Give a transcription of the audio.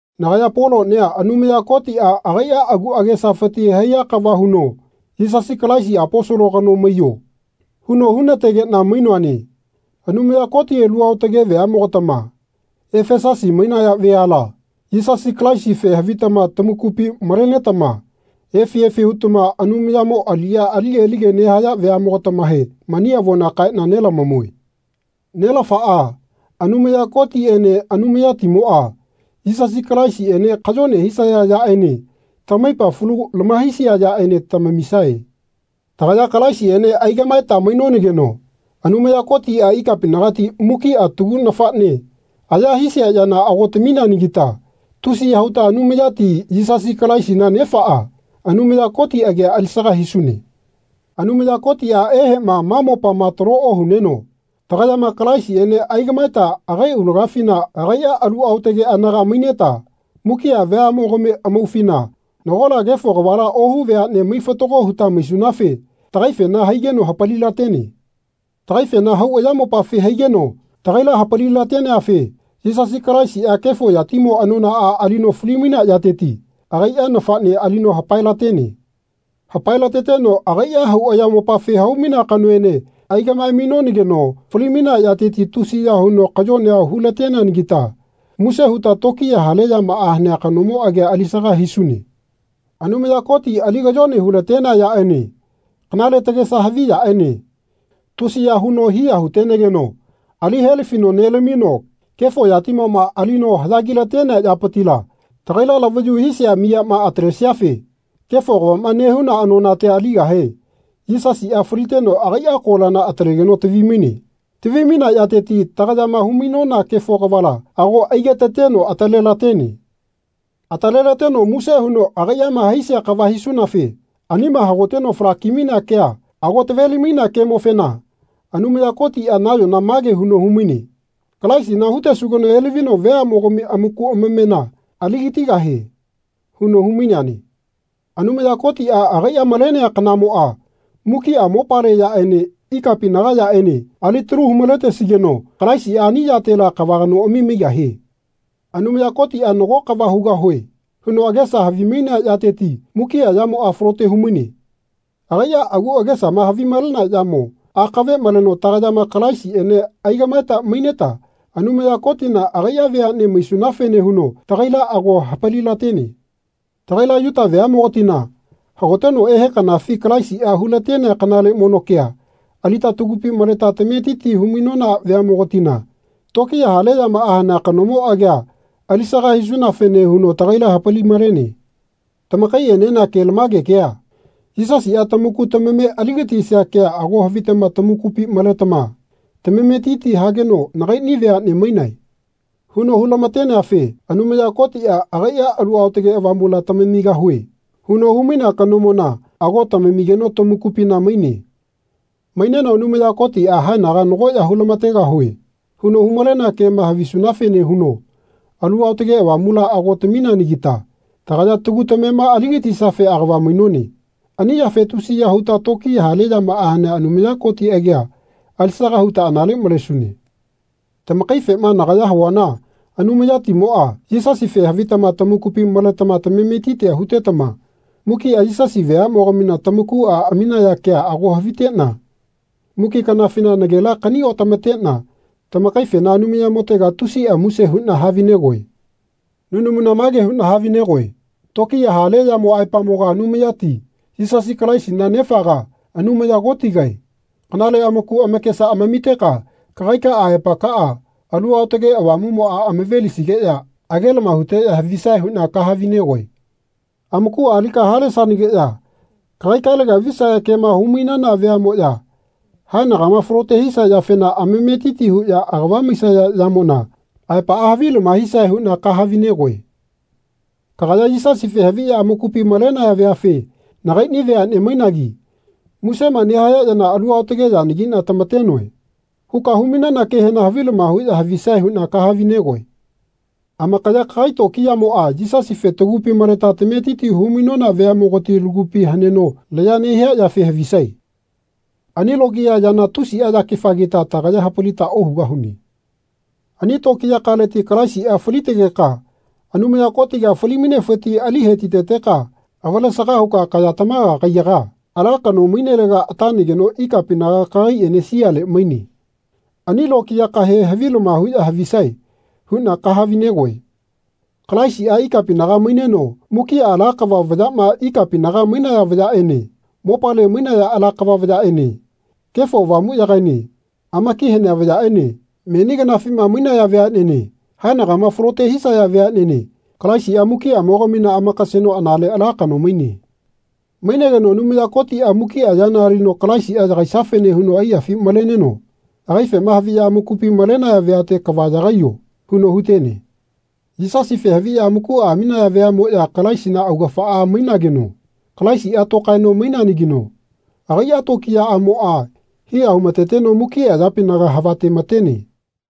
Nagaya Polonia Anumaya Kotia agaia agu agesafiti haiya kava huno Yisasi Kalaisi Aposolo kano maiyo. huno hunategena mainoane. Anumaya Koti alu aotage veamogatama Efesusi mainaya veala Yisasi Kalaisife havitama tamakupi malenetama efi efi hutama Anumayamo aliya alike alike nehaya veamogatamahe mani avona kaena nelamamue. Nelafaa, Anumaya Kotiene Anumayatimoa, Yisasi Kalaisiene kayone hisaya yaene tamaipa falu lamahaisia yaene tamamisae. Tagaya Kalaisiene aigamaeta mainonageno Anumaya Kotia ikapinagati mukia tagu nafane aya hisia yana ago tamineanagita tusiya huta Anumayati, Yisasi Kalaisina Nefaa, Anumaya Koti agia alisaga hisune. Anumaya Kotia ehema ma mopama talo ohuneno tagayama Kalaisiene aigamaeta agai aulagafina agaia alu aotage anaga maineta mukia veamogami amaufina nagola kefo kavala ohu veane mai-fatago huta maisunafe tagaifena haigeno hapalilatene. Tagaifena hau ayamopafi haigeno tagaila hapali-lateneafe Yisasi Kalaisia kefo yatimo anonaa alino fali-mainea yateti agaia nafane alino hapae-latene. Hapae-lateteno agaia hau ayamopafi haumainea Kanoene aigamae-mainonageno fali-mainea yateti tusiya huno kayonea hu-lateneanagita muse huta tokiya hale yamaa hanea kanomo agia alisaga hisune. Anumaya Koti ali kayone hu-latenea yaene kanale tagesa havi yaene tusiya huno hiya hutenegeno ali helafino nelamino kefo yatimoma alino hayagi-latenea yapitila tagaila lavayu hisia miyama atalesiafe kefo kavama nehuna anonatia aligahe Yisasia faliteno agaia kolana atalegeno lavi-maine. Tavi-mainea yateti tagayama humainona kefo kavala ago aigetateno atalelatene. Atalelateno muse huno agaiama haisia kava havisunafe anima hagoteno falaki-malenea kea ago taveli-mainea kemofena Anumaya Kotia nayona mage huno humaine Kalaisina hutesugeno elavino veamogami amaku amamena aligatigahie. huno humaineane. Anumaya Kotia agaia malenea kanamoa mukia mopale yaene ikapinaga yaene alitalu hu-maletesigeno Kalaisia ani yatela kava kanoami maigahie. Anumaya Kotia Nago kava hugahue. huno agesama havimainea yateti mukia yamoa falote humaine. Agaia agu agesama havimalea yamo akave maleno tagayama Kalaisiene aigamaeta maineta Anumaya Kotina agai veane maisunafene huno tagaila ago hapali-latene. Tagaila Yuta veamogatina hagoteno ehe kanafi Kalaisia hulatenea kanale mono kea alita tagupi maleta lametiti humainona veamogatina tokiya hale yamaa hanea kanomo agia alisaga hisunafene huno tagaila hapali-malene. Tamakaienena kelamage kea, Yisasia tamaku tamame aligatisia kea ago havitama tamakupi maletama tamametiti hageno Nagaini veane mainae. huno hu-lamateneafe Anumaya Kotia agaia Alu Aotage Avamula Tamamigahue. huno humainea kanomona ago tamamigeno tamakupina maine. Maineno Anumaya Kotia Haenaga nago ya hulamategahue. huno humalenea kema havisunafene huno Alu Aotage Avamula ago tamineanagita tagaya tagu tamema aligatisiafe agava mainone. Ani yafe tusiya huta tokiya hale yamaa hanea Anumaya Koti agia alisaga huta anale malesune. Tamakaifema nagaya havuana Anumayatimoa, Yisasife havitama tamakupi maletama tamametitia hutetama mukia Yisasi veamogamina tamakua amaminaya kea ago havitena mukia kanafina nagela kani-otamatena tamakaifena Anumayamotega tusia muse huna havinegoe. Nunamuna mage huna havinegoe Tokiya hale yamo aepamoga Anumayati, Yisasi Kalaisina Nefaga, Anumaya Kotigae, kanale amaku amakesa amamiteka kagaika aepakaa Alu Aotage Avamumoa amavelisigeya agelama huteya havisae huna kahavi-negoe. Amakua alika halesanageya kagaikalega visaya kema humainana veamoya haenagama falote hisia yafena amametiti huya agava maisaya yamona aepaa havilama hisae huna kahavi-negoe. Kagaya Yisasife haviya amakupi malenaya veafe Nagaini veane mainagi musema nehaya yana alu aotage yanagina tamatenoe. huka humainana kehena havilama huya havisae huna kahavi-negoe. Amakaya kagai tokiyamoa Yisasife tagupi maleta tametiti humainona veamogati lagupi haneno laya nehia yafe havisae. Ani lokiya yana tusia yakefagita tagaya hapalita ohugahune. Ani tokiyakaleti Kalaisia falitegeka Anumaya Kotiga fali-mainefiti ali hetiteteka avalesaga huka kaya tamaga kaiyaga ala kano mainelega atanageno ikapinaga kagaiene siale maine. Ani lokiyakahe havilama huya havisae. huna kahavi-negoe. Kalaisia ikapinaga maineno mukia ala kava vayama ikapinaga mainaya vayaene mopale mainaya ala kava vayaene Kefo Avamuyagaene amaki hanea vayaene meni kanafima mainaya veanene haenagama falote hisaya veanene Kalaisia mukiamogamina amakaseno anale ala kano maine. Mainegeno Anumaya Kotia mukia yana alino Kalaisia yagaisiafene huno aiyafi maleneno agaifema haviya amakupi malenaya veate Kava yagaiyo. huno hutene. Yisasife haviya amakua aminaya veamoya Kalaisina augafaa mainageno Kalaisia tokaeno maineanagino agaia tokiyaamoa hiya humateteno mukia yapinaga havatematene.